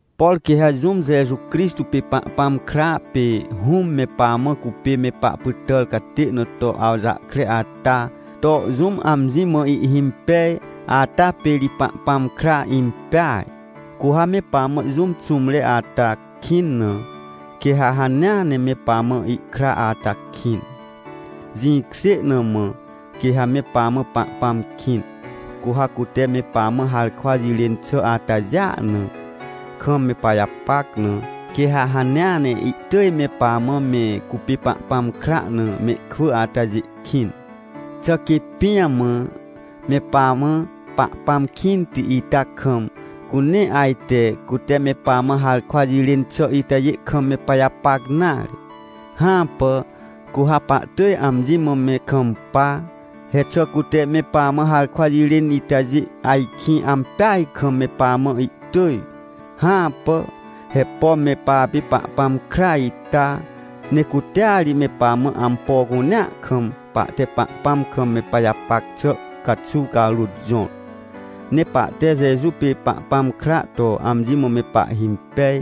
Por quê ha jũm Jeju Crixtô pê Pahpãm kra, pê Hũm me pamã cupê me pahpytàr catê na to awjahkre ata to jũm amji mã ihhimpej, ata pê ri Pahpãm kra impeaj. Cu ha me pamã jũm xũmre ata kĩn na, quê ha hanea ne me pamã ihkra ata kĩn. Jĩkjê na mã, quê ha me pamã Pahpãm kĩn, cu ha cute me pamã harkwa jirên xà atajêa na, kam me pajapac na, quê ha hanea ne ihtỳj me pamã me cupê Pahpãm kra na mehkwỳ atajê kĩn. Xà quê pijamã me pamã Pahpãm kĩnti ita kam, cu nee ajte cute me pamã harkwa jirên xà itajê kam me pajapac nare? Hãpà, cu ha pahtỳj amji mã me kampa! He xà cute me pamã harkwa jirên itajê ajkĩ ampeaj kam me pamã ihtỳj? Hãpà. He pom me papê Pahpãm kra ita, ne cutea ri me pamã ampo cunea kam, pahte Pahpãm kam me pajapac xà caxuw carôt jõr. Ne pahte Jeju pê Pahpãm kra to amji mã me pahhimpej,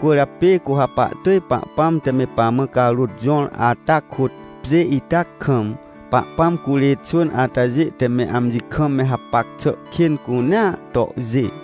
cwỳrjapê cu ha pahtỳj, Pahpãm te me pamã carôt jõr ata kôt, pjê ita kam Pahpãm curê xwỳn atajê te me amji kam me hapac xà kên cunea tohjê.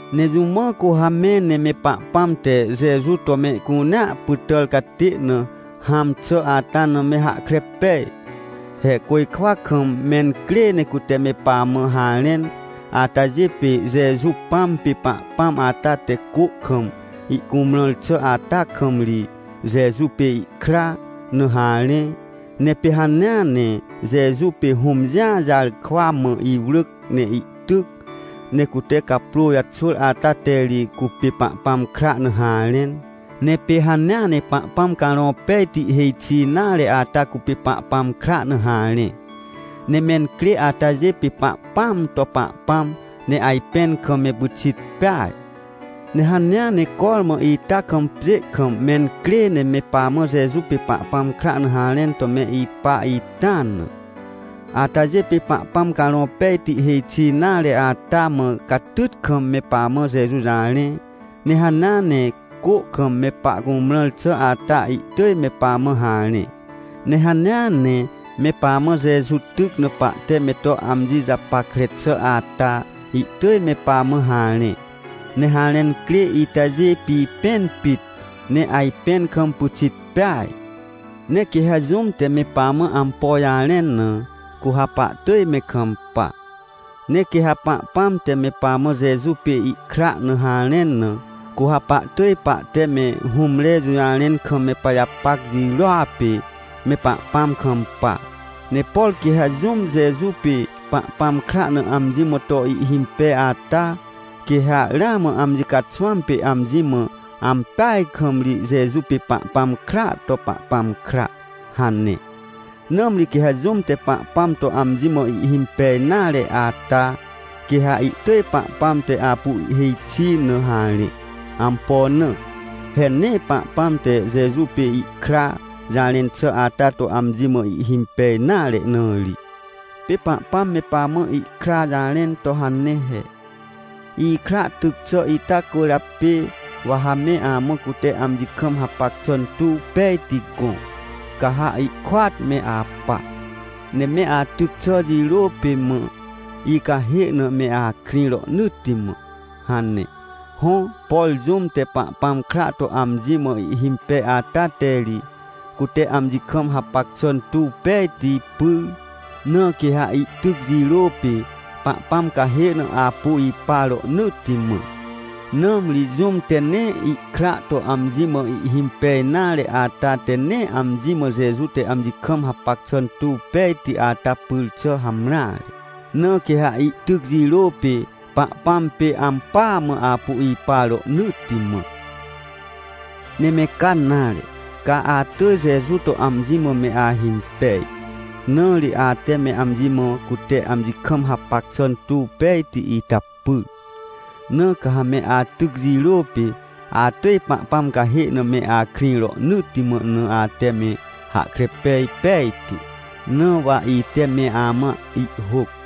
Ne jũ mã cu ha me, ne me Pahpãm te Jeju to mehcunea pytàr catê na hãm xà ata na me hahkre pej? He côjkwa kam mencrê ne cute me pamã harẽn. Atajê pê, Jeju Pãm pê Pahpãm ata te cô kam ihcumrãr xà ata kam ri, Jeju pê ihkra na harẽ. Ne pê hanea ne Jeju pê Hũm Jĩa Jarkwamã iwrỳc ne ihtyc, ne cute caprô jaxwỳr ata te ri, cupê Pahpãm kra na harẽn. Ne pê hanea ne Pahpãm Carõ Pejti hêj xi nare ata cupê Pahpãm kra na harẽ. Ne mencrê atajê pê Pahpãam to Pahpãm, ne ajpẽn kam me pyxit peaj. Ne hanea ne cormã ita kam pjê kam mencrê ne me pamã Jeju pê Pahpãm kra na harẽn to me ipa ita na. Atajê pê Pahpãm Carõ Pejti hêj xi nare ata, mã catyt kam me pamã Jeju jarẽ. Ne hanea ne cô kam me pahcumrãr xà ata ihtỳj me pamã harẽ. Ne hanea ne me pamã Jeju tyc na pahte me to amji japackre xà ata, ihtỳj me pamã harẽ. Ne harẽn crê itajê pipẽn pit, ne ajpẽn kam pyxit peaj. Ne quê ha jũm te me pamã ampo jarẽn na, cu ha pahtỳj me kampa. Ne quê ha Pahpãm te me pamã Jeju pê ihkra na harẽn na, cu ha pahtỳj pahte me hũmre jũjarẽn kam me pajapac jirôa pê me Pahpãm kampa. Ne por quê ha jũm Jeju pê Pahpãm kra na amji mã to ihhimpej ata, quê ha ramã amji caxwãm pê amji mã: — Ampeaj kam ri Jeju pê Pahpãm kraa to Pahpãm kra — hane. Nãmri quê ha jũm te Pahpãm to amji mã ihhimpej nare ata, quê ha ihtỳj Pahpãm te apu ihhêj xi na harẽ. Ampo na? He nee Pahpãm te Jeju pê ihkra jarẽn xà ata to amji mã ihhimpej nare na ri. Pê Pahpãm me pamã ihkra jarẽn to hane he: — Ikra tyc xà ita cwỳrjapê, wa ha me amã cute amji kam hapac xà tuw pejti gõ, ca ha ihkôat me apa, ne me atyc xà jirô pê mã icahê na me akrĩ rohnỳtti mã — hane. Hõ, por jũm te Pahpãm kra to amji mã ihhimpej ata te ri, cute amji kam hapac xà tuw pejti pyr. Na quê ha ihtyc jirô pê, Pahpãm cahê na apu ipa rohnỳtti mã. Nãmri jũm te nee ihkra to amji mã ihhimpej nare ata te nee amji mã Jeju te amji kam hapac xà tuw pejti ata pyr xà hamreare. Na quê ha ihtyc jirô pê, Pahpãm pê ampỳa mã apu ipa rohnỳtti mã. Ne me ca nare. Ca atỳj Jeju to amji mã me ahimpej, na ri ate me amji mã cute amji kam hapac xà tuw pejti ita pyr. Na ca ha me atyc jirô pê, atỳj Pahpãm cahê na me akrĩ rohnỳtti mã na ate me hahkre pej pejtu, na wa ite me amã ihhôc.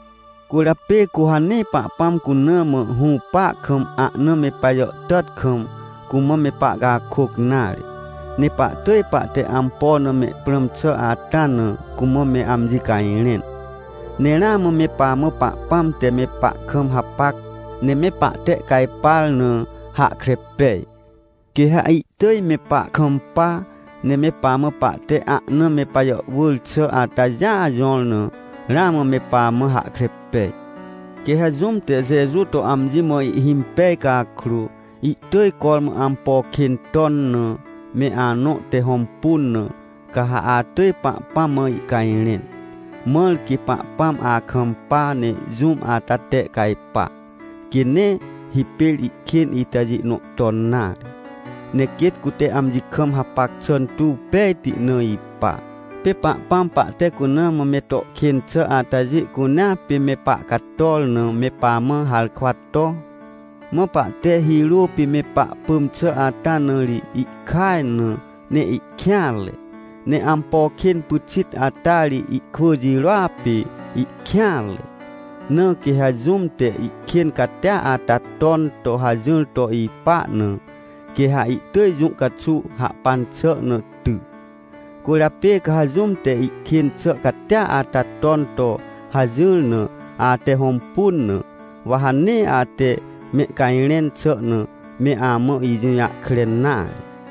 Cwỳrjapê cu ha nee Pahpãm cuna mã hũpa kam, ahna me pajàhtàt kam, cumã me pahcakôc nare, ne pahtỳj pahte ampo na me prãm xà ata na, cumã me amji cajrẽn. Ne ramã me pamã Pahpãm te me pahkam hapac, ne me pahtehcajpar na hahkre pej. Quê ha ihtỳj me pahkampa, ne me pamã pahte ahna me pajàhwỳr xà atajêa jõr na, ramã me pamã hahkre pej. Quê ha jũm te Jeju to amji mã ihhimpej cakrô, ihtỳj cormã ampo kên ton na, me anõ te hõmpun na, ca ha atỳj Pahpãm mã ihcajrẽn. Mãr quê Pahpãm akampa ne jũm ata tehcajpa, quê nee hipêr ihkên itajê nõ ton nare, ne quêt cute amji kam hapac xà tuw pejti na ipa. Pê Pahpãm pahte cuna mã me to kên xà atajê cunea pê me pahcator na me pamã harkwa to. Mã pahte hirô pê me pahpỳm xà ata na ri ihkaj na, ne ihkêanre. Ne ampo kên pyxit ata ri ihkwỳ jirôa pê ihkêanre. Na quê ha jũm te ihkên catia ata ton to hajỹr to ipa na, quê ha ihtỳj jũ caxuw hahpan xà na ty. Cwỳrjapê ca ha jũm te ihkên xà catia ata ton to hajỹr na, ate hõmpun na, wa ha nee ate mehcajrẽn xà na, me amã ijũjahkre nare.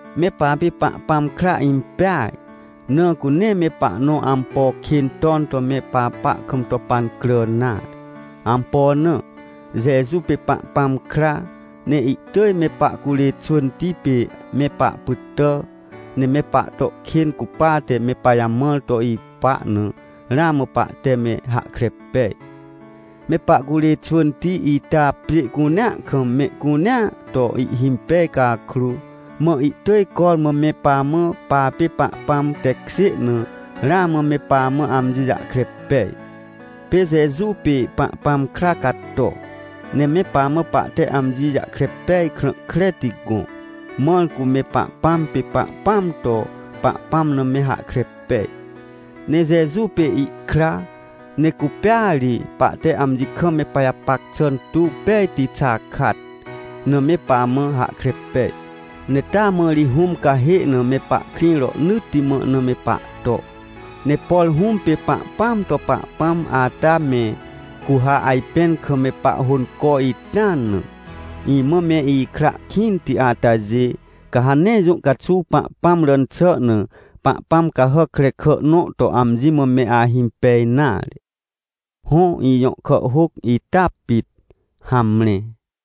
Me papê Pahpãm kra impeaj, na cu nee me pahnõ ampo kên ton to me papa kam to pancrà nare. Ampo na? Jeju pê Pahpãm kra, ne ihtỳj me pahcurê xwỳnti pê me pahpytà, ne me pahto kên cupate me pajamãr to ipa na, ramã pahte me hahkre pej. Me pahcurê xwỳnti ita pjê cunea kam mehcunea to ihhimpej cakrô, mã ihtỳj cormã me pamã papê Pahpãm tekjê na, ramã me pamã amji jahkre pej. Pê Jeju pê Pahpãm kra cato, ne me pamã pahte amji jahkre pej krã kreti gõ, mãr cu me Pahpãm pê Pahpãam to Pahpãm na me hahkre pej. Ne Jeju pê ihkra, ne cupêa ri pahte amji kam me pajapac xà tuw pejti xakat na me pamã hahkre pej. Ne taa mã ri Hũm cahê na me pahkrĩ rohnỳtti mã na me pahto. Ne por Hũm pê Pahpãam to Pahpãm ata me, cu ha ajpẽn kam me pahhônco ita na. Imã me ikra kĩnti atajê, ca ha nee jũ caxuw Pahpãm ràn xà na pahpãm cahàc krekà nõ to amji mã me ahimpej nare. Hõ, ijõ kàhhôc ita pit. Hamre.